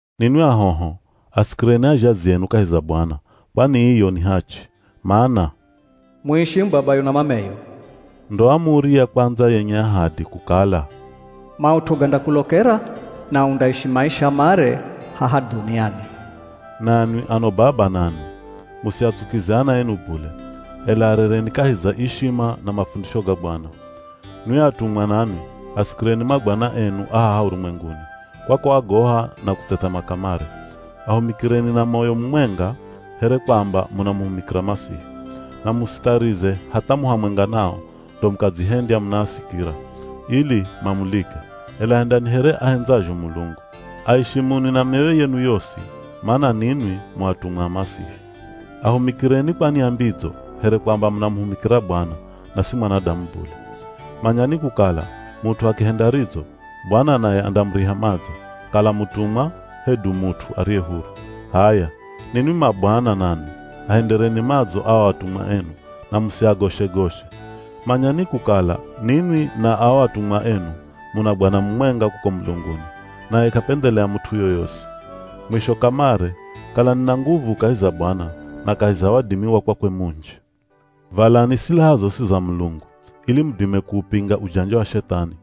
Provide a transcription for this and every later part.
Ninwi ahoho, asikireni azhazi enu kahi za Bwana, kwani iyo ni hachi. Mana, “Muishimu babayo na mameyo,” ndo amuri ya kwandza yenye ahadi kukala, “maut'u gandakulokera, na undaishi maisha mare haha dhuniani.” Nanwi ano baba nanwi, musiatsukize ana enu bule, ela arereni kahi za ishima na mafundisho ga Bwana. Nwi atumwa nanwi, asikireni mabwana enu a haha urumwenguni, kwa kuagoha na kuthethema kamare. Ahumikireni na moyo mumwenga, here kwamba munamuhumikira Masihi. Na musitharize hatha mu hamwenga nao, ndo mukadzihendya munaasikira, ili mamulike, ela hendani here ahendzazho Mulungu. Aishimuni na mioyo yenu yosi, mana ninwi mu atumwa a Masihi. Ahumikireni kwa nia mbidzo, here kwamba munamuhumikira Bwana, na si mwanadamu bule. Manyani kukala mut'u akihenda ridzo, Bwana naye andamuriha madzo, kala mutumwa, hedu mut'u ariye huru. H'aya ninwi mabwana nanwi, ahendereni madzo ao atumwa enu, na musiagoshe-goshe. Manyani kukala ninwi na ao atumwa enu, muna Bwana mumwenga kuko mulunguni, naye k'apendhelea mut'u yoyosi. Mwisho kamare, kalani na nguvu kahi za Bwana, na kahi za wadimi wa kwakwe munji. Valani silaha zosi za Mulungu, ili mudime kuupinga ujanja wa Shethani.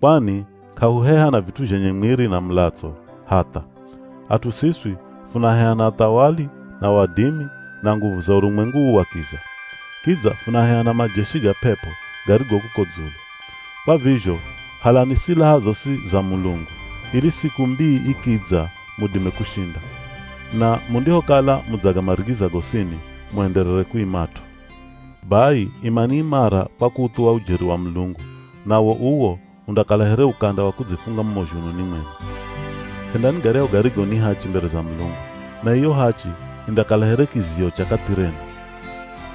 Kwani k'ahuheha na vit'u zhenye mwiri na mulatso, hatha. At'u siswi funaheha na athawali, na wadimi, na nguvu za urumwengu uu wa kiza. Kidza funaheha na majeshi ga p'ep'o, garigo kuko dzulu. Kwa vizho halani silaha zosi za Mulungu, ili siku mbii ikidza mudime kushinda. Na mundihokala mudzagamarigiza gosini, muenderere kuimat'o. Bai imani imara kwa kuuthuwa ujeri wa Mulungu, nawo uwo undakala here ukanda wa kudzifunga mumo zhununi mwenu. Hendani garyahu garigo ni hachi mbere za Mulungu, na iyo hachi indakala here kiziyo cha kathi renu.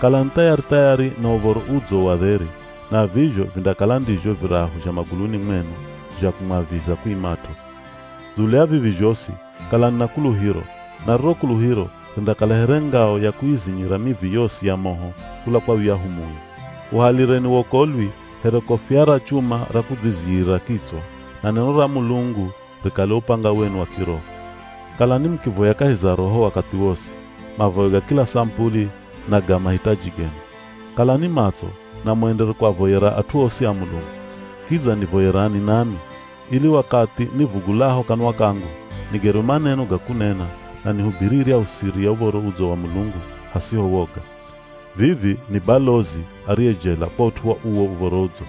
Kalani thayari-thayari na Uv̱oro Udzo wa dheri, na vizho vindakala ndizho virahu zha maguluni mwenu zha kumwaviza kuimat'o. Dzulu ya vivi zhosi, kalani na kuluhiro, na riro kuluhiro rindakala here ngao ya kuizinyira mivi yosi ya moho kula kwa yuyahu Mui. Uhalireni wokolwi here kofia ra chuma ra kudziziyira kitswa, na neno ra Mulungu rikale upanga wenu wa kiroho. Kalani mukivoya kahi za Roho wakathi wosi, mavoyo ga kila samupuli na ga mahitaji genu. Kalani matso, na muenderere kuavoyera at'u osi a Mulungu. Kidza nivoyerani nami, ili wakathi nivugulaho kanwa kangu, nigerwe maneno ga kunena, na nihubiri iryahu siri ya Uv̱oro Udzo wa Mulungu hasiho woga. Vivi ni balozi ariye jela kwa ut'u wa uwo Uv̱oro Udzo,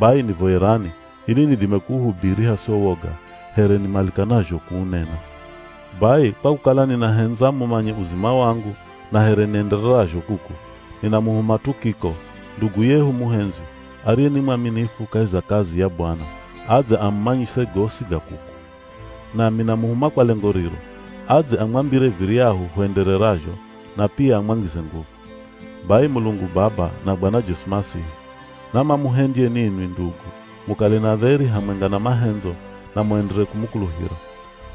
bai nivoyerani ili nidime kuuhubiri hasiho woga, here nimalikanazho kuunena. Bai kwa kukala ninahendza mumanye uzima wangu na here niendererazho kuku, ninamuhuma Tukiko, ndugu yehu muhendzwi, ariye ni mwaminifu kahi za kazi ya Bwana, adze amumanyise gosi ga kuku. Nami namuhuma kwa lengo riro, adze amwambire viryahu huendererazho, na pia amwangize nguvu. Bai Mulungu Baba na Bwana Jesu Masihi, namamuhendye ninwi ndugu, mukale na dheri hamwenga na mahendzo na muenderere kumukuluhira.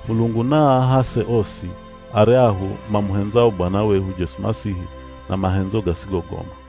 Mulungu naaahase osi aryahu mamuhendzao Bwana wehu Jesu Masihi na mahendzo gasigogoma.